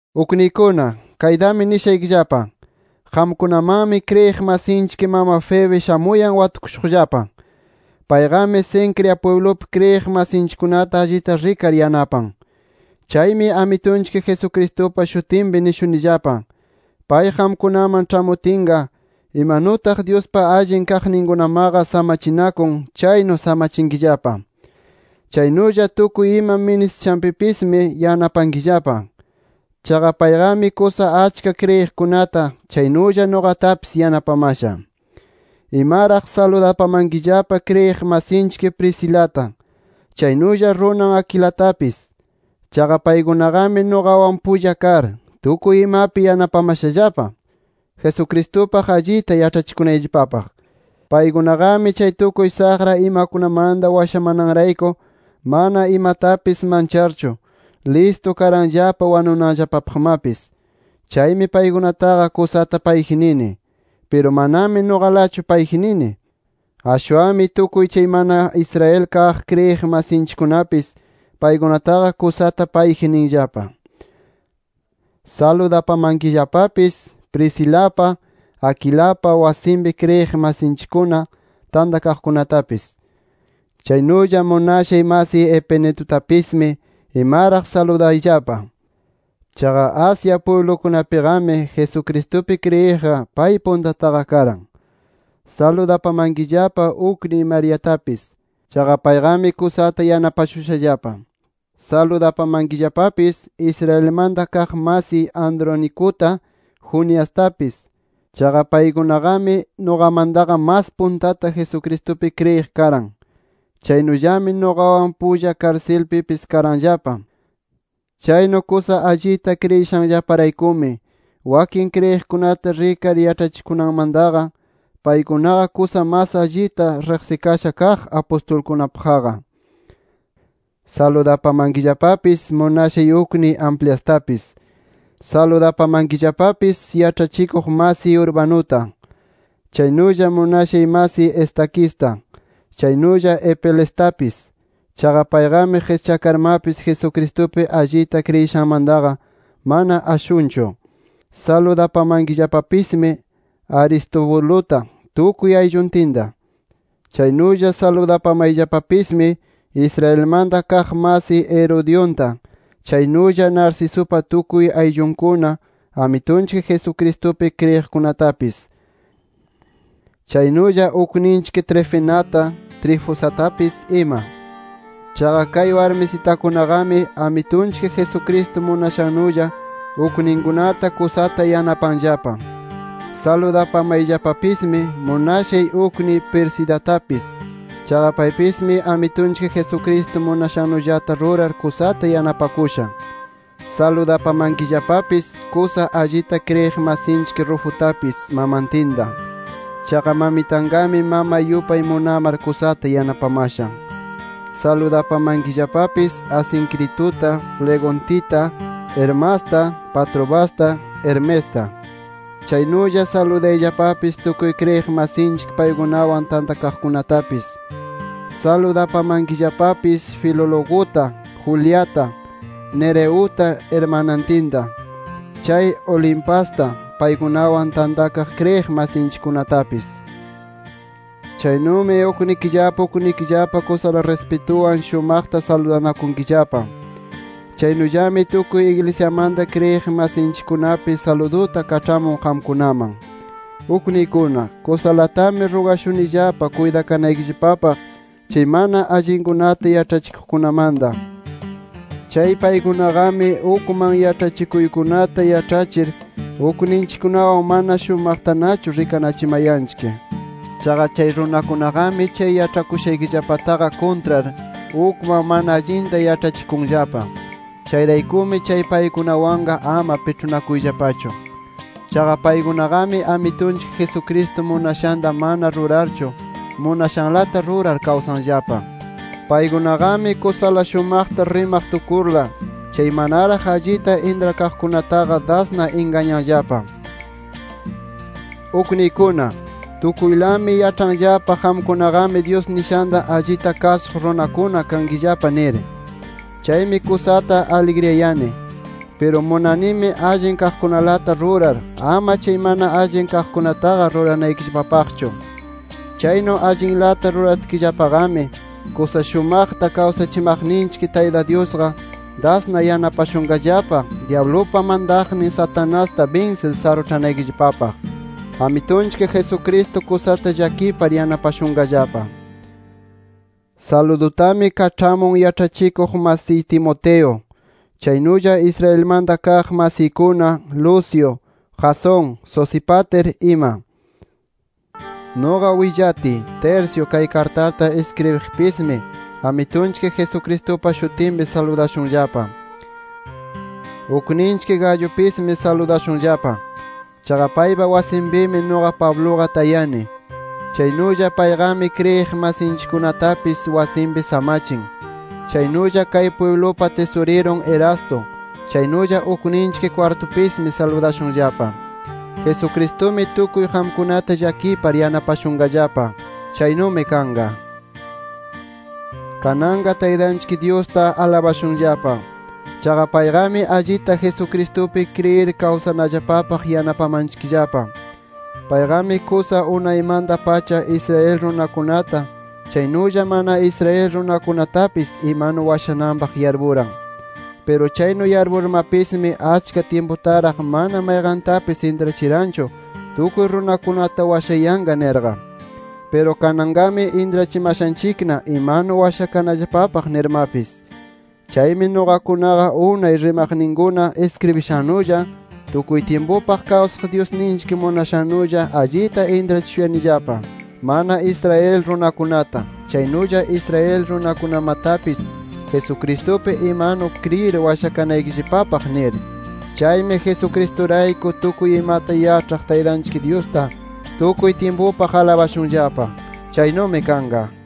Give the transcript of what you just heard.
Ukniykuna, kaytami nishaykillapa: Qamkunamanmi kriyiq masinchik mama Febe shamuyan watukushuqllapa. Payqami, Cencrea pwiblupi kriyiq masinchikkunata allita rikar yanapan. Chaymi Amitunchik Jesucristupa shutinpi nishunillapa: Pay qamkunaman ĉhamutinqa imanutaq Dyuspa allin kaqninkunamaqa samachinakun, chaynu samachinkillapa. Chaynulla tukuy ima ministishanpipismi yanapankillapa. Chaqa payqami kusa achka kriyiqkunata, chaynulla nuqatapis yanapamasha. Imaraq saludapamankillapa kriyiq masinchik Priscilata, chaynulla runan Aquilatapis. Chaqa paykunaqami nuqawan pulla kar, tukuy imapi yanapamashallapa, Jesucristupaq allita yaĉhachikunayllapapaq. Paykunaqami, chay tukuy saqra imakunamanta washamananrayku mana imatapis mancharchu, listu karanllapa wanunanllapapaqmapis. Chaymi paykunataqa kusata payji nini. Piru manami nuqalachu payji nini. Ashwanmi tukuy chay mana Israel kaq kriyiq masinchikkunapis, paykunataqa kusata payji ninllapa. Saludapamankillapapis Priscilapa, Aquilapa wasinpi kriyiq masinchikkuna tantanakuqtapis. Chaynulla munashay masiy Epenetutapismi imaraq saludayllapa. Chaqa Asia pwiblukunapiqami Jesucristupi kriyiqqa, pay puntataqa karan. Saludapamankillapa ukniy Mariatapis. Chaqa payqami kusata yanapashushallapa. Saludapamankillapapis Israelmanta kaq masiy Andronicuta, Juniastapis. Chaqa paykunaqami nuqamantaqa mas puntata Jesucristupi kriyiq karan. Chaynullami, nuqawan pulla karsilpipis karanllapa. Chaynu kusa allita kriyishanllaparaykumi, wakin kriyiqkunata rikar yaĉhachikunamantaqa, paykunaqa kusa mas allita riqsikasha kaq apustulkunapaqqa. Saludapamankillapapis munashay ukniy Ampliastapis. Saludapamankillapapis yaĉhachikuq masiy Urbanuta, chaynulla munashay masiy Estaquista, chaynulla Apelestapis. Chaqa payqami qischakarmapis, Jesucristupi allita kriyishanmantaqa mana ashunchu. Saludapamayllapapismi Aristobuluta tukuy aylluntinta. Chaynulla saludapamayllapapismi Israelmanta kaq masiy Herodionta, chaynulla Narcisupa tukuy ayllunkuna Amitunchik Jesucristupi kriyiqkunatapis, chaynulla ukninchik Trifenata, Trifosatapis ima. Chaqa kay warmisitakunaqami Amitunchik Jesucristo munashannulla ukninkunata kusata yanapanllapa. Saludapamayllapapismi munashay ukniy Persidatapis. Chaqa paypismi Amitunchik Jesucristo munashannullata rurar kusata yanapakusha. Saludapamankillapapis kusa allita kriyiq masinchik Rufutapis, mamantinta. Chaqa mamitanqami mamay yupay munamar, kusata yanapamasha. Saludapamankillapapis Asincrituta, Flegontita, Hermasta, Patrobasta, Hermesta. Chaynulla saludayllapapis tukuy kriyiq masinchik paykunawan tantakaqkunatapis. Saludapamankillapapis Filologuta, Juliata, Nereuta irmanantinta, chay Olimpasta, paykunawan tantakaq kriyiq masinchikkunatapis. Chaynumi uknikillapa uknikillapa kusala rispituwan shumaqta saludanakunkillapa. Chaynullami tukuy iglisyamanta kriyiq masinchikkunapis saluduta kaĉhamun qamkunaman. Ukniykuna, kusalatami rugashunillapa kuytakanaykillapapaq, chay mana allinkunata yaĉhachikuqkunamanta. Chay paykunaqami ukman yaĉhachikuykunata yaĉhachir, ukninchikkunawan mana shumaqtanachu rikanachimayanchik. Chaqa chay runakunaqami, chay yaĉhakushaykillapataqa kuntrar, ukman mana allinta yaĉhachikunllapa. Chayraykumi chay paykunawanqa ama piĉhunakuyllapachu. Chaqa paykunaqami Amitunchik Jesucristo munashanta mana rurarchu, munashanlata rurar kawsanllapa. Paykunaqami kusala shumaqta rimaq tukurla, chay manaraq allita intrakaqkunataqa dasna ingañanllapa. Ukniykuna, tukuylami yaĉhanllapa qamkunaqami Dyus nishanta allita kasuq runakuna kankillapa nir. Chaymi kusata aligriyani. Piru munanimi allin kaqkunalata rurar, ama chay mana allin kaqkunataqa ruranaykillapapaqchu. Chaynu allinlata ruratkillapaqami, kusa shumaqta kawsachimaqninchik Tayta Dyusqa dasna yanapashunqallapa, dyablupa mantaqnin Satanasta binsir saruĉhanaykillapapaq. Amitunchik Jesucristo kusata llakipar yanapashunqallapa. Saludutami kaĉhamun, yaĉhachikuq masiy Timoteo, chaynulla Israelmanta kaq masiykuna Lucio, Jasón, Sosípater ima. Nuqa willatiy, Tercio kay kartata iskribiqpismi, Amitunchik Jesucristupa shutinpi saludashunllapa. Ukninchik Gayupismi saludashunllapa. Chaqa paypa wasinpimi, nuqa Pabluqa tayani. Chaynulla payqami kriyiq masinchikkunatapis wasinpi samachin. Chaynulla kay pwiblupa tisurirun Erasto, chaynulla ukninchik Cuartupismi saludashunllapa. Jesucristumi tukuy qamkunata llakipar, yanapashunqallapa. ¡Chaynumi kanqa! Kananqa Taytanchik Dyusta alabashunllapa. Chaqa payqami allita Jesucristupi kriyir kawsanallapapaq yanapamanchikllapa. Payqami kusa unaymanta-pacha Israel runakunata chaynulla mana Israel runakunatapis imanu washananpaq yarpuran. Piru chaynu yarpurmapismi, achka tyimputaraq mana mayqantapis intrachiranchu tukuy runakunata washayanqa nirqa. Piru kananqami intrachimashanchikna imanu washakananpaq nirmapis. Chaymi nuqakunaqa, unay rimaqninkuna iskribishannulla tukuy tyimpupaq kawsaq Dyusninchik munashannulla allita intrachishuyanillapa, mana Israel runakunata, chaynulla Israel runakunamatapis Jesucristupi imanu kriyir washakanaykillapapaq nir. Chaymi Jesucristurayku, tukuy imata yaĉhaq Taytanchik Dyusta tukuy tyimpupaq alabashunllapa. Chaynumi kanqa.